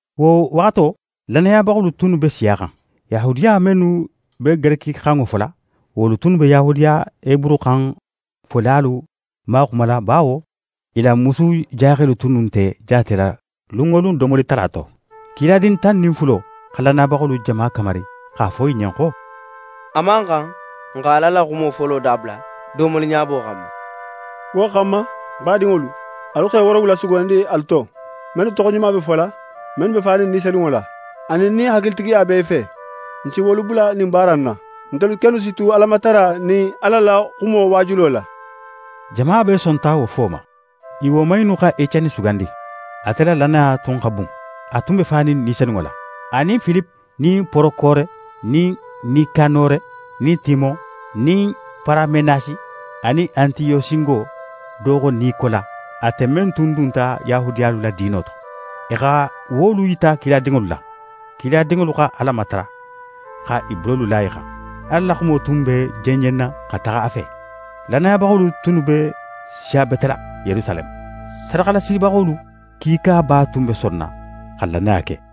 Wo waxato, lannayabaxolu tunnu be siyaxan. Yahudiya mennu be gerekixanŋo fola, wolu tunnu be Yahudiya heburuxan folalu maxumala bawo i la musujaxelu tunnu nte jaatela lun wo lun domoli tala to. Kiladin tan nin fulo xa lannayabaxolu jama kamari x'a fo i ɲen xo: «A man xan, n xa Ala la xumo folo dabula domoliɲabo xanma. Wo xanma, n badinŋolu, alu xe woorowula sugandi alu to, mennu toxoɲuma be fola, mennu be fanin Ni Senunŋo la, anin nin hakilitigiya be i fe. N si wolu bula ɲin baara in na. Ntelu kennu si tu Alamatara nin Ala la xumo waajulo la.» Jama bee sonta wo fo ma. I woman innu xa Eceni sugandi, ate la lannaya tun xa bun, a tun be fanin Ni Senunŋo la; anin Filipe nin Porokore nin Nikanore; nin Timon; nin Paramenasi; anin Antiyosingo do xo Nikola, ate men tun dunta Yahudiyalu la diino to. I xa wolu yita kiladinŋolu la. Kiladinŋolu xa Ala matara, xa i bulolu la i xan. Ala la xumo tun be jenjenna xa taxa a fe. Lannayabaxolu tunnu be siyabetela Yerusaleme. Sadaxalasibaxolu kiikaba tun be sonna xa lannaya ke.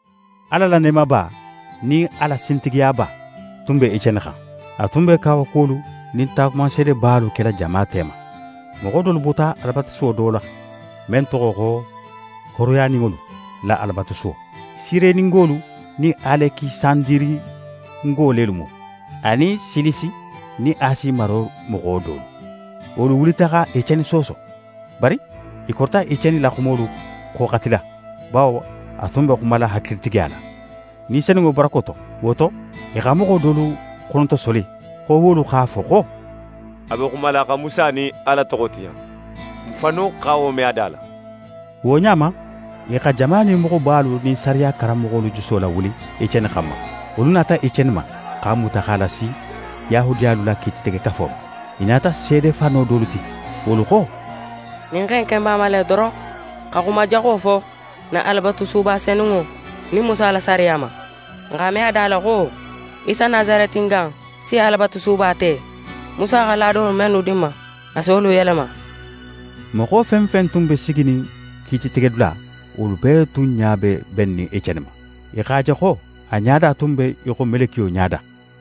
Ala la neemaba nin a la sintigiyaba tun be Eceni xan. A tun be kawakuwolu nin taagumanseedebalu kela jama tema. Moxo dolu bota Alabatusuwo do la, men toxo xo «Hooroyaninŋolu la Alabatusuwo». Sireningolu nin Alekisandiringo lelu mu, anin Silisi nin Asi maro moxo dolu. Wolu wulita xa Eceni sooso. Bari i korita Eceni la xumolu xoxatila, bawo a tun be xumala hakilitigiya la, Ni Senunŋo barako to. Wo to, i xa moxo dolu xonotosoli xo wolu x'a fo xo: «A be xumala xa Musa nin Ala toxo tiɲa. N fannu xa wo me a da la.» Wo ɲa ma, i xa jama nin moxobalu nin sariya karanmoxolu juso lawuli Eceni xanma. Wolu nata Eceni ma, x'a muta x'a lasi Yahudiyalu la Kiititegekafo ma. I nata seede fano dolu ti. Wolu xo: «Ɲin xe in ken b'a ma le doron xa xuma jaxo fo n na Alabatusuba senunŋo nin Musa la sariya ma. N x'a me a da la xo Isa Nasaretinga in si Alabatusuba te, Musa xa laadolu mennu di n ma, a si wolu yelema.» Moxo fen fen tun be siginin kiititegedula, wolu bee tun ɲa be bennin Eceni ma. I x'a je xo a ɲada tun be í xo melekiyo ɲada.